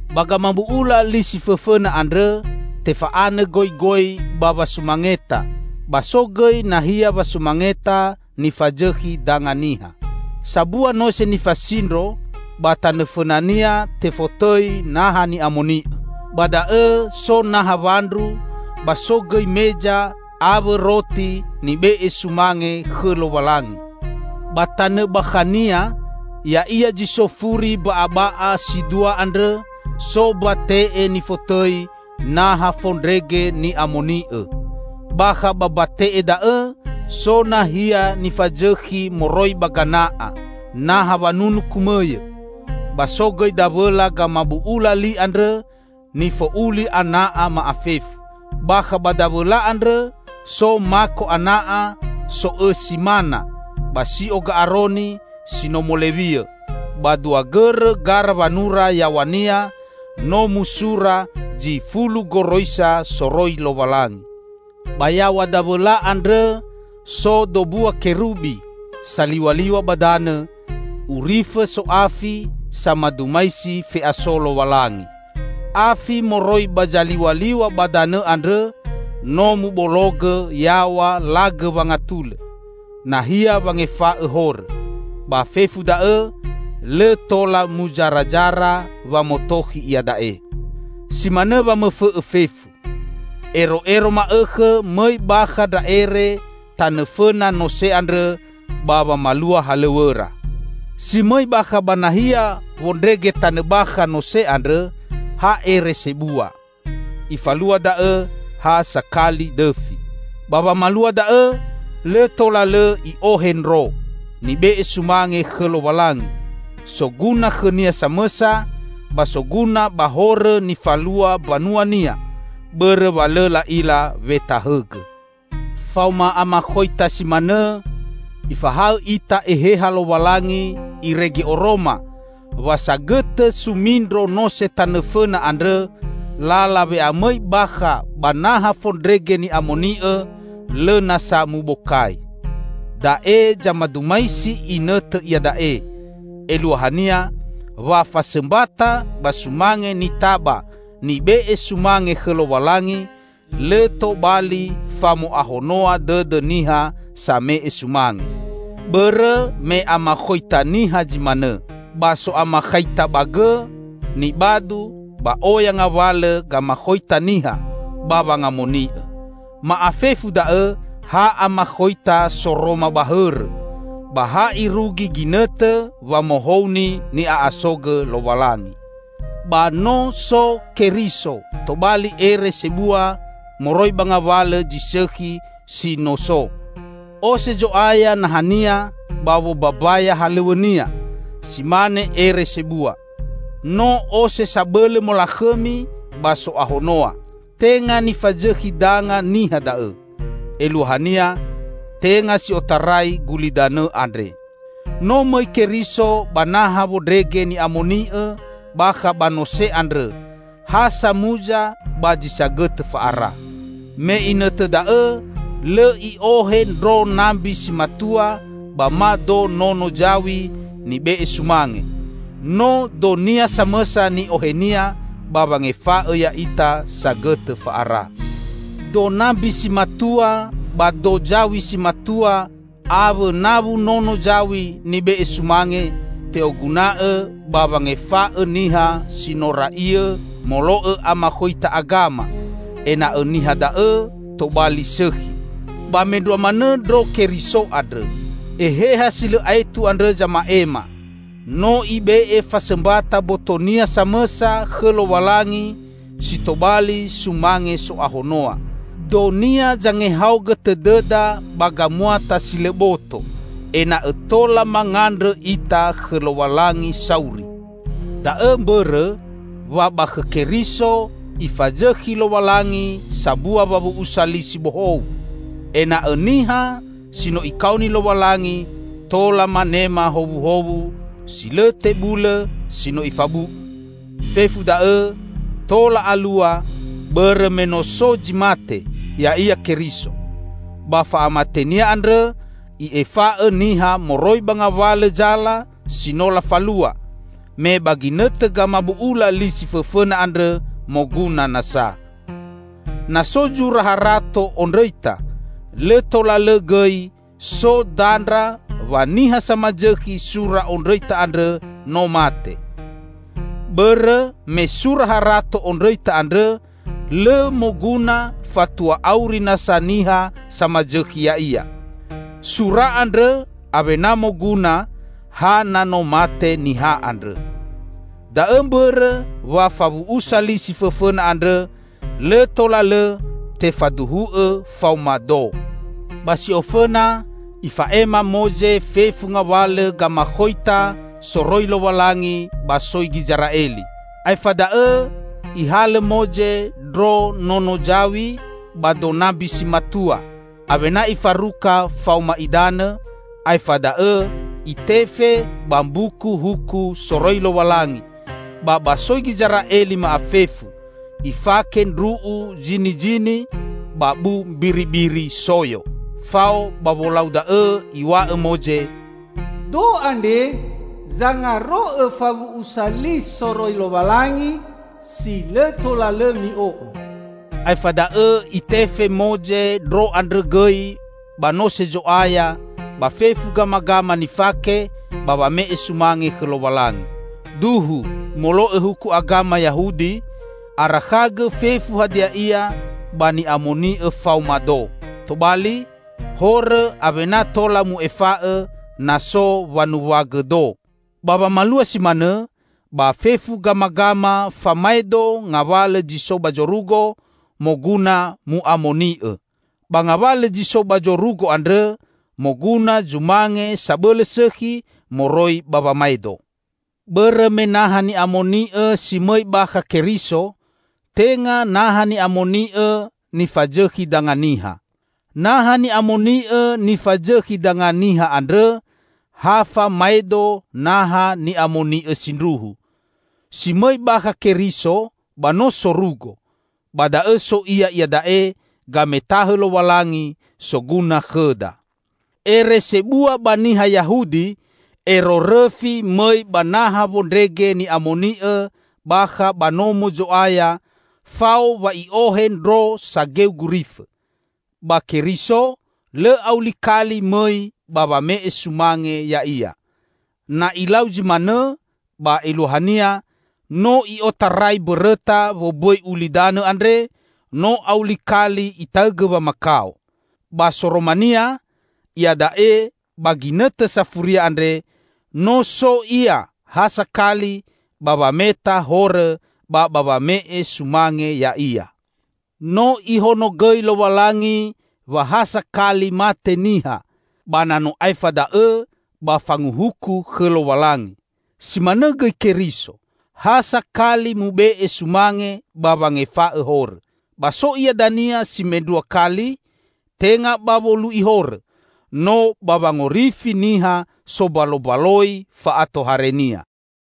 Ba gamabu'ula li si fõfõna andrõ tefa'anõ goigoi ba wasumangeta, ba so gõi nahia wasumangeta nifazõkhi danga niha. Sambua nose nifasindro, ba tanõ fõnania tefotõi Naha Ni'amoni'õ. Ba da'õ so naha wandru, ba so gõi meza awõ roti nibe'e sumange khõ Lowalangi. Ba tanõ bakhania ya'ia zi so furi mba'aba'a si dua andrõ so mbate'e nifotõi Naha Fondrege Ni'amoni'õ. Bakha ba mbate'e da'õ so nahia nifazõkhi moroi ba gana'a, naha wanunu kumõyõ, ba so gõi Dawõla Gamabu'ula Li andrõ nifo'uli ana'a ma'afefu. Bakha ba Dawõla andrõ so mako ana'a so'õsi mana ba si'o Ga'aroni si no molewiõ, ba dua gõrõ gara wanura yaw̃ania no musura zi fulu goroisa soroi Lowalangi. Ba yaw̃a Dawõla andrõ so dombua Kerubi, saliw̃aliw̃a ba danõ, urifõ so'afi samadumaisi fe'aso Lowalangi. Afi moroi ba zaliw̃aliw̃a ba danõ andrõ no mubologõ yaw̃a lagõ wangatulõ, nahia wangefa'õ horõ. Ba fefu da'õ lõ tola muzarazara wamotokhi iada'e. Si manõ wamõfõ'õ fefu. Ero'ero ma'õkhõ mõi bakha ndra ere tanõ fõna nose andrõ ba wamalua halõw̃õra. Si mõi bakha ba nahia wondrege tanõ bakha nose andrõ, ha ere sebua. Ifalua da'õ ha sakali dõfi. Ba wamalua da'õ lõ tola lõ i'ohe ndro, nibe'e sumange khõ Lowalangi, soguna khõnia samõsa, ba soguna ba horõ nifalua mbanua-Nia bõrõ wa lõ la'ila wetahõgõ. Faoma amakhoita si manõ, Ifahaõ ita Eheha Lowalangi irege oroma, wa sagõtõ sumindro nose tanõ fõna andrõ, lala we'amõi bakha ba Naha Fondrege Ni'amoni'õ lõ na sa mubokai. Da'e zamadumaisi inõtõ iada'e; eluahania, wa fasõmbata ba sumange nitaba nibe'e sumange khõ Lowalangi, lõ tobali famo'ahonoa dõdõ niha same'e sumange. Bõrõ me amakhoita niha zi manõ, ba so amakhaita ba gõ, nibadu, ba oya ngawalõ gamakhoita niha ba wangamoni'õ. Ma'afefu da'õ ha amakhoita soroma ba hõrõ, ba ha irugi ginõtõ wamohouni ni'a'asogõ Lowalangi. Ba no so Keriso tobali Ere Sebua moroi ba ngawalõ zi sõkhi si no so. Ose Zo'aya naha-Nia ba wombambaya halõw̃õ-Nia si mane Ere Sebua, no ose sabõlõ molakhõmi ba so'ahonoa. Tenga nifazõkhi danga niha da'õ; eluahania, tenga si otarai gulidanõ andre. No mõi Keriso ba Naha Wondrege Ni'amoni'õ bakha ba nose andrõ ha samuza ba zi sagõtõ fa'ara. Me inõtõ da'õ lõ i'ohe ndro nambi si matua ba ma do nono zaw̃i nibe'e sumange; no do-Nia samõsa ni'ohe-Nia ba wangefa'õ ya'ita sagõtõ fa'ara. Do nambi si matua ba do zaw̃i si matua awõ nawu nono zaw̃i nibe'e sumange, te'oguna'õ ba wangefa'õ niha si no ra'iõ molo'õ amakhoita agama, ena'õ niha da'õ tobali sõkhi. Ba mendrua manõ ndro Keriso andrõ! Eheha si lõ aetu andrõ zama'ema, no Ibe'e fasõmbata mboto-Nia samõsa khõ Lowalangi si tobali sumange so'ahonoa. Do-Nia zangehaogõ tõdõda ba gamuata si lõ boto, ena'õ tola mangandrõ ita khõ Lowalangi sauri. Da'õ mbõrõ, wa ba khõ Keriso Ifazõkhi Lowalangi sambua wawu'usa li si bohou, ena'õ niha si no Ikaoni Lowalangi tola manema howuhowu si lõ tebulõ si no Ifabu'u. Fefu da'õ tola alua bõrõ me no so zi mate, ya'ia Keriso; ba fa'amate-Nia andrõ i'efa'õ niha moroi ba ngawalõ zala si no lafalua, me ba ginõtõ gamabu'ula li si fõfõna andrõ moguna nasa. Na so zura harato ondrõita, lõ tola lõ gõi so dandra wa niha samazõkhi sura ondrõita andrõ no mate. Bõrõ me sura harato ondrõita andrõ lõ moguna fatua auri nasa niha samasõkhi ya'ia. Sura andrõ awena moguna ha na no mate niha andrõ. Da'õ mbõrõ wa fawu'usa li si fõfõna andrõ lõ tola lõ tefaduhu'õ faoma do. Ba si ofõna, ifa'ema Moze fefu ngawalõ gamakhoita soroi Lowalangi ba soi Gizera'eli. Aefa da'õ ihalõ Moze ndro nono zaw̃i ba do nambi si matua, awena ifaruka faoma idanõ, aefa da'õ itefe ba Mbuku Huku soroi Lowalangi ba ba soi Gizera'eli ma'afefu, ifake ndru'u zinizini ba bu mbiribiri soyo. Fao ba wolau da'õ iw̃a'õ Moze: "Do andre zangaro'õ fawu'usa li soroi Lowalangi si lõ tola lõ mi'o'õ." Aefa da'õ itefe Moze ndro andrõ gõi ba Nose Zo'aya ba fefu gamagama nifake ba wame'e sumange khõ Lowalangi. Duhu molo'õ huku agama Yahudi, arakhagõ fefu hadia ia ba ni'amoni'õ faoma do. Tobali, horõ awena tola mu'efa'õ na so wanuwagõ do. Ba wamalua si manõ, ba fefu gamagama famaedo ngawalõ zi so ba zorugo, moguna mu'amoni'õ. Ba ngawalõ zi so ba zorugo andrõ moguna zumange sabõlõ sõkhi moroi ba wamaedo. Bõrõ me Naha Ni'amoni'õ si mõi bakha Keriso, tenga Naha Ni'amoni'õ nifazõkhi danga niha. Naha Ni'amoni'õ nifazõkhi danga niha andrõ ha famaedo Naha Ni'amoni'õ sindruhu. Si mõi bakha Keriso ba no sorugo; ba da'õ so Ia iada'e gametahõ Lowalangi, soguna khõda. Ere Sebua ba niha Yahudi, ero rõfi mõi ba Naha Wondrege Ni'amoni'õ bakha ba Nomo Zo'aya fao wa i'ohe ndro sageu gurifõ. Ba Keriso, lõ auli kali mõi ba wame'e sumange Ya'ia. Na Ilau zi manõ, ba eluahania no i'otarai mbõrõta wombõi ulidanõ andre, no auli kali Itaõgõ wamakao. Ba soromania, iada'e ba ginõtõ safuria andre, no so Ia ha sakali ba wameta horõ ba ba wame'e sumange Ya'ia. No Ihonogõi Lowalangi wa ha sakali mate niha, ba na no aefa da'õ ba fanguhuku khõ Lowalangi. Si manõ gõi Keriso, ha sakali mube'e sumange ba wangefa'õ horõ. Ba so Ia dania si mendrua kali, tenga ba wolu'i horõ, no ba wangorifi niha sombalombaloi fa'atohare-Nia.